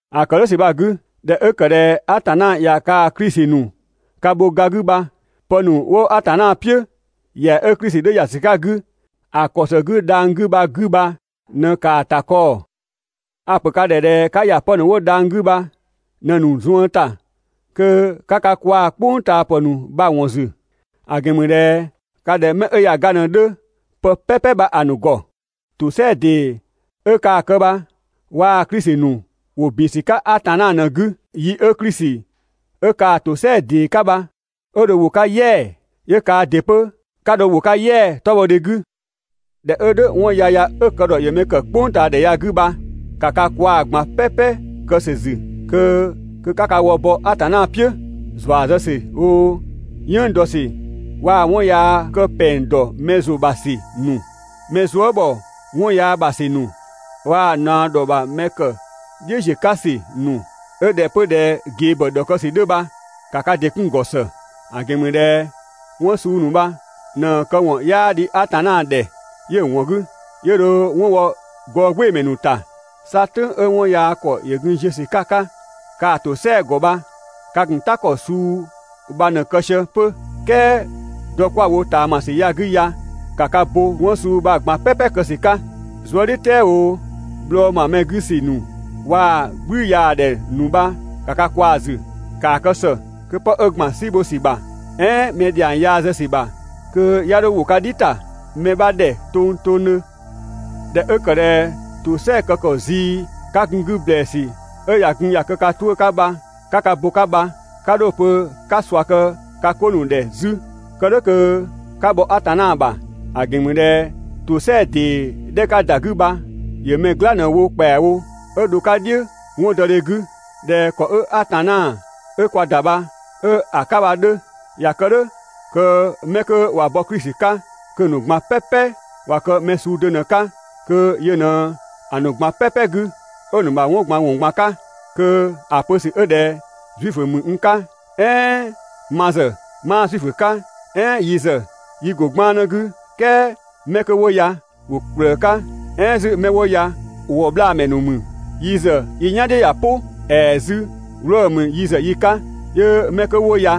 ‑A ‑kë "dhʋ̈ ‑sü bha‑ 'gü, ꞊dhɛ 'ö ‑kë ꞊dhɛ Atanna ꞊ya kaa‑ Klisi ‑nu ka bho ga 'gü bha, pë ‑nu 'wo Atanna "piʋ̈, ‑yɛa 'ö Klisi 'dhö ‑ya ‑sü 'ka‑ 'gü ‑a ‑kɔ ‑së 'gü dhang‑ 'gü bha‑ 'gü bha ꞊në ‑kaa ‑ta kɔɔ‑. A‑ ‑pö ka ‑dhɛ ꞊dhɛ 'ka ‑ya pë ‑nu 'wo dhang‑ 'gü bha ꞊në‑ ‑nu zuën ‑ta kö 'ka ka kwaa‑ "kpʋngtaapë ‑nu bha‑ ‑wɔn ‑zü. ‑A ‑gɛn ‑mü ꞊dhɛ ka ꞊dhɛ 'mɛ 'ö ꞊ya ga ꞊në‑ 'dhö pë "pɛpɛ bha‑ ‑nu ‑gɔ. ‑Tosɛa ‑dee 'ö kaa‑ kë bha waa‑ Klisi ‑nu ‑wo ‑bin ‑sü 'ka Atanna ꞊në‑ 'gü. Yi 'ö Klisi 'ö kaa‑ ‑tosɛa ‑dee 'ka bha 'ö dho ‑wo 'ka "yɛa‑, 'yö kaa ‑dɩ 'pö 'ka ‑wo 'ka "yɛa‑ 'tɔbhɔdhe 'gü. ꞊Dhɛ 'ö "dhʋ̈, 'wɔn yaya 'ö‑ kë ‑dhɔ ‑yö mɛ ‑kë "kpʋngtaadhɛ ya‑ 'gü bha, ‑ka ka kwaa‑ ꞊gban "pɛpɛ kë ‑sü ‑zü kö 'ka ka wë bɔ Atanna "piʋ̈. ‑Zua zë ‑sü oo, "yënng dɔ waa‑ 'wɔn yaa kë ‑pɛng ‑dɔ mɛ ‑zʋ ‑bha ‑sü ‑nu, mɛ zuë" ‑bhɔ 'wɔn yaa ‑bha ‑sü ‑nu waa‑ ꞊naɔ ‑dhɔ ‑bha mɛ ‑kë "dhiʋ̈ ziö 'ka ‑sü ‑nu 'ö ꞊dhɛ 'pö ꞊dhɛ ꞊gebhɔ ‑dhɔkë ‑sü 'dhö bha, ‑ka ka ‑dɩ 'kun‑ ‑gɔ ‑së. ‑A ‑gɛn ‑mü ꞊dhɛ 'wɔn suu ‑nu bha ꞊në‑ këwɔn 'yaa dhi Atanna ‑dhɛ 'yö‑ ‑wɔn 'gü 'yö dho 'wɔn wɔ gɔɔgbɩɩmɛ ‑nu ‑ta. 'Sa "tʋ̈ng 'ö 'wɔn yaa ‑kɔ ‑yö gun ziö ‑sü 'ka‑ 'ka kaa‑ ‑tosɛa ‑gɔ bha ka ‑gun "ta ‑kɔ suu bha ꞊në‑ kë sië 'pö. "Kɛɛ dɔ 'kwa‑ wo ꞊taamasü ‑ya 'gü ya ‑ka ka bo 'wɔn suu bha‑ ꞊gban "pɛpɛ kë ‑sü 'ka. Zuëdhiʋ̈dhɛ oo, bhlɔɔ ‑ma mɛ 'gü ‑sü ‑nu waa‑ "gblüyaadhɛ ‑nu bha ‑ka ka kwaa‑ ‑zü. ‑Kaa kë ‑së kö 'pë 'ö ‑gban "si bho ‑sü ‑bha, "ɛɛn mɛ ‑dhiang yaa zë ‑sü ‑bha kö 'ya 'dho ‑wo ka "dhi ‑ta mɛ 'bha ‑dhɛ tongtongdhö. ꞊Dhɛ 'ö ‑kë ꞊dhɛ ‑tosɛa kë ‑kɔ zii 'ka gun‑ 'gü ‑blɛɛsü 'ö ꞊ya gun ꞊ya kë ka 'tuʋ̈‑ 'ka bha 'ka ka bo‑ 'ka bha, 'ka 'dho‑ pö 'ka ꞊sua kë ka 'ko ‑nu ‑dhɛ 'zü (kë "dhʋ̈ kö 'ka bhɔ Atanna ‑bha). ‑A ‑gɛn ‑mü ꞊dhɛ ‑tosɛa ‑dee 'dhɛ 'ka ‑da 'gü bha ‑yö mɛ "gla ꞊në‑ wo ‑kpɛawo 'ö dho‑ 'ka "dhiʋ̈ 'wɔndɔdhe 'gü, ꞊dhɛ ‑kɔ 'ö Atanna 'ö kwa ‑da bha 'ö‑ 'ka bha‑ 'dhö. ‑Ya kë "dhʋ̈ kö 'mɛ 'kö ꞊wa bɔ Klisi 'ka, kö‑ ‑nu ꞊gban "pɛpɛ ꞊wa kë mɛ suu do ꞊në‑ 'ka, kö yö ꞊në‑ ‑nu ꞊gban "pɛpɛ 'gü, 'ö‑ ‑nu ‑bha 'wɔn ꞊gban ‑wɔn ꞊gban 'ka. Kö ‑a pö ‑sü 'ö ꞊dhɛ Zuifö ‑mü n 'ka, "ɛɛn ma ‑zë 'maa Zuifö 'ka, "ɛɛn yi ‑zë yi ‑go 'gbannë 'gü "kɛɛ 'mɛ 'kö 'wo ya ‑wo ‑kplëë 'ka, "ɛɛn 'zü 'mɛ 'wo ya ‑wɔbhlaamɛ ‑nu ‑mü, yi ‑zë yi "yan "dhiʋ̈ ꞊ya "pʋ, ‑ɛɛ 'zü 'wlɔɔ‑ ‑mü yi ‑zë yi 'ka, 'yö 'mɛ 'kö 'wo ya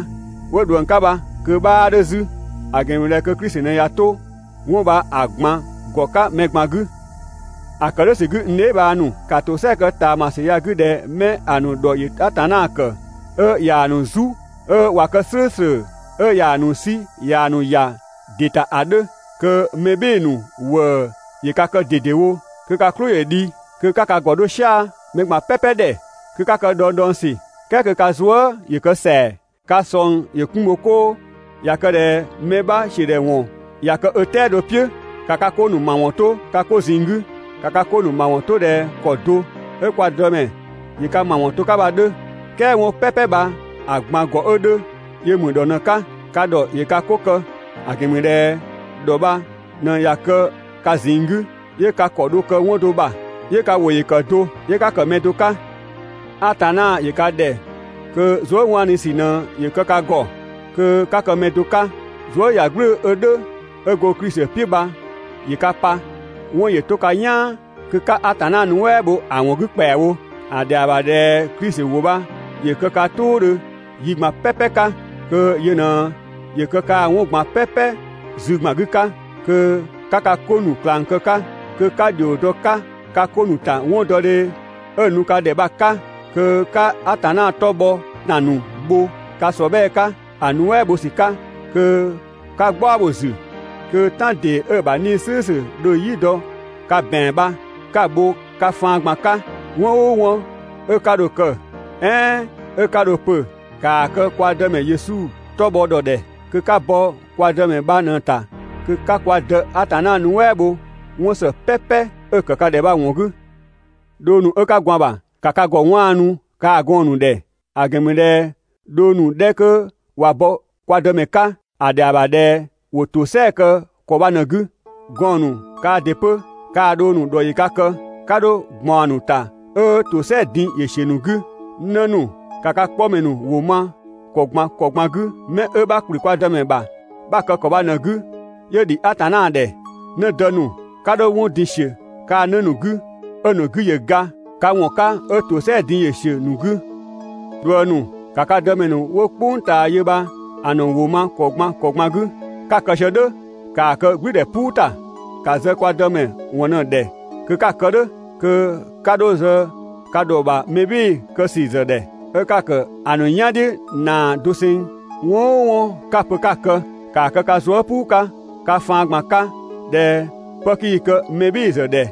'wo ꞊dhuëng 'ka bha kö‑ 'bhaa 'dhö 'zü. ‑A ‑gɛn ‑mü ꞊dhɛ kö Klisi ꞊në ꞊ya 'to 'wɔn bha‑ ꞊gban ‑gɔ 'ka mɛ ꞊gban 'gü. ‑A ‑kë "dhʋ̈ ‑sü 'gü n dheebhang ‑nu, ‑ka ‑tosɛa kë ꞊taamasü ya‑ 'gü ꞊dhɛ 'mɛ‑ ‑nu ‑dhɔ ‑yö Atanna ‑kë, 'ö ꞊yaa‑ ‑nu "zu 'ö ꞊wa kë "slʋ̈ʋ̈slʋ̈, 'ö ꞊yaa‑ ‑nu 'sü ꞊yaa‑ ‑nu ‑ya ‑dɩ ‑ta ‑a 'dhö. Kö mɛ "bhɩɩ‑ ‑nu ‑wëë ‑yö ka kë ꞊dedewo, kö 'ka "klʋ ‑yö dhi, kö 'ka ka ‑gɔ 'dho "sia‑ mɛ ꞊gban "pɛpɛ ‑dhɛ, kö 'ka kë dhɔngdhɔngsü, "kɛɛ kö ka zuë" ‑yö kë ‑sɛa. Ka ꞊sɔng ‑yö 'kun bho 'koo. ꞊Ya kë ꞊dhɛ mɛ 'bha ‑siödhɛwɔn ꞊ya kë ö "tɛado "piʋ̈, ‑ka ka 'ko ‑nu ‑mawɔn 'to ka 'ko ꞊zinng 'gü. ‑Ka ka 'ko ‑nu ‑mawɔn 'to ꞊dhɛ ‑kɔ do 'ö kwa Dëmɛ ‑yö ka ‑mawɔn to‑ 'ka bha‑ 'dhö. "Kɛɛ 'wɔn "pɛpɛ bha‑ ꞊gban ‑gɔ 'ö 'dhö, yö ‑mü ‑dhɔ ꞊në‑ 'ka. Ka ‑dhɔ ‑yö ka 'ko kë, ‑a ‑gɛn ‑mü ꞊dhɛ ‑dhɔ bha ꞊në ꞊ya kë ka ꞊zinng 'gü, 'yö ka ‑kɔ dho kë 'wɔn do ‑bha, 'yö ka ‑wʋ ‑yö ‑kë do, 'yö 'ka ‑kë mɛ do 'ka. Atanna ‑yö ka ‑dhɛ kö zuëwaanusü ꞊në ‑yö kë ka ‑gɔ, kö 'ka kë mɛ do 'ka, zuëyagblʋ̈ʋ̈‑ 'ö "dhʋ̈ 'ö go Klisi "piʋ̈ bha ‑yö ka pa. 'Wɔn ‑yö 'to ka "yaan kö 'ka Atanna nuɛ" bho‑ ‑wɔn 'gü ‑kpɛawo. ‑A ‑dhɛa ‑bha ꞊dhɛ Klisi ‑wʋ bha ‑yö kë ka "tʋʋdhö yi ꞊gban "pɛpɛ 'ka, kö yö ꞊në ‑yö kë kaa‑ 'wɔn ꞊gban "pɛpɛ zü ‑gban 'gü 'ka, kö 'ka ka 'ko ‑nu ꞊klang kë‑ 'ka, kö 'ka ‑dhio dɔ‑ 'ka ka 'ko ‑nu ‑ta 'wɔndɔdhe 'ö‑ nu ka ‑dhɛ bha‑ 'ka, kö 'ka Atanna 'tɔ bhɔ ‑tan ‑nu bho ka ‑sɔbhɛɛ 'ka ‑a nuɛ" bho ‑sü 'ka, kö 'ka "gbaɔ bho‑ ‑zü, kö "tan ‑dee 'ö‑ ‑bha 'Nii‑ "slʋ̈ʋ̈slʋ̈ dho "yi dɔ‑ 'ka ka ‑bɛan bha 'ka‑ bho ka faan ꞊gban 'ka. 'Wɔn "ʋʋ 'wɔn 'ö 'ka dho‑ kë, "ɛɛn 'ö 'ka dho‑ pö, ‑kaa kë kwa Dëmɛ Yesu 'tɔ bhɔ ‑dhɔ ‑dhɛ kö 'ka bɔ kwa Dëmɛ bha ꞊në‑ ‑ta kö 'ka kwa Dë Atanna nuɛ" bho 'wɔn ‑së "pɛpɛ 'ö‑ kë ka ‑dhɛ bha‑ ‑wɔn 'gü. Dhong ‑nu 'ö 'ka gwaan‑ ‑bha, ‑ka ka ‑gɔ 'waanu kaa‑ gɔɔn‑ ‑nu ‑dhɛ. ‑A ‑gɛn ‑mü ꞊dhɛ dhong ‑nu 'dhɛ 'kö ꞊wa bɔ kwa Dëmɛ 'ka, ‑a ‑dhɛa ‑bha ꞊dhɛ ‑wo ‑tosɛa kë ‑kɔ bha ꞊në‑ 'gü. Gɔɔn‑ ‑nu kaa ‑dɩ 'pö, kaa‑ dhong ‑nu ‑dhɔ ‑yö ka kë, 'ka 'dho ꞊gbaɔn‑ ‑nu ‑ta 'ö ‑tosɛa din ‑yö ‑siö ‑nu 'gü. 'Në ‑nu, ‑ka ka 'kpɔmɛ ‑nu ‑wʋ ma ‑kɔ ꞊gban ‑kɔ ꞊gban 'gü, 'mɛ 'ö 'bha ‑kplü kwa Dëmɛ ‑bha 'bha‑ kë ‑kɔ bha ꞊në‑ 'gü 'yö ‑dhi Atanna ‑dhɛ. 'Nëdë ‑nu, 'ka 'dho 'wɔn din ‑siö kaa‑ 'në ‑nu 'gü 'ö‑ ‑nu 'gü ‑yö ga ka ‑wɔn 'ka 'ö ‑tosɛa din ‑yö ‑siö ‑nu 'gü. ꞊Dhuëng ‑nu, ‑ka ka dëmɛ ‑nu 'wo "kpʋng ꞊taa yö bha‑ ‑nu ‑wʋ ma ‑kɔ ꞊gban ‑kɔ ꞊gban 'gü. 'Ka‑ kë sië "dhʋ̈, ‑kaa kë "gblʋ̈ʋ̈dhɛ "puu ‑ta, ‑ka zë kwa Dëmɛ ‑wɔn ꞊në‑ ‑dhɛ kö 'ka‑ kë "dhʋ̈, kö 'ka 'dho zë ka ‑dhɔ ‑bha mɛbhɩɩdhe kë ‑sü ‑zë ‑dhɛ 'ö 'ka‑ ‑kë ‑a ‑nu "yandhiʋ̈ ꞊naa doseng. 'Wɔn "ʋʋ 'wɔn 'ö 'ka‑ pö 'ka‑ kë, ‑kaa kë ka zuë" "puu 'ka ka faan ꞊gban 'ka ꞊dhɛ 'pë 'kii‑ kë mɛ "bhɩɩ‑ ‑zë ‑dhɛ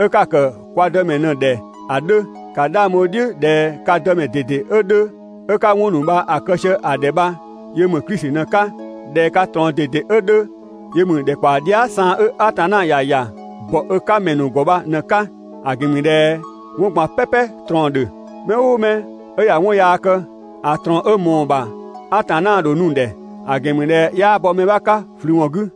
'ö 'ka‑ ‑kë kwa Dëmɛ ꞊në‑ ‑dhɛ ‑a 'dhö. ‑Ka 'dhang bho‑ "dhiʋ̈ ꞊dhɛ ka Dëmɛ ꞊dede 'ö 'dhö 'ö 'ka 'wɔn ‑nu bha‑ kë sië‑ ‑dhɛ bha yö ‑mü Klisi ꞊në‑ 'ka. ꞊Dhɛ ka ꞊trɔɔn ꞊dede 'ö 'dhö yö ‑mü ‑dhɛkpaɔ dhia" saan 'ö Atanna ‑ya ‑ya ‑bɔ ö 'ka ‑mɛ ‑nu ‑gɔ bha ꞊në‑ 'ka. ‑A ‑gɛn ‑mü ꞊dhɛ 'wɔn ꞊gban "pɛpɛ ꞊trɔɔn‑ ‑dhö. Mɛ "ʋʋ mɛ 'ö ꞊ya 'wɔn yaa kë, ‑a ꞊trɔɔn 'ö ꞊mɔɔ‑ ‑bha Atanna ‑dho nu‑ ‑dhɛ, ‑a ‑gɛn ‑mü ꞊dhɛ 'yaa bɔ mɛ 'bha 'ka ꞊flü ‑wɔn 'gü.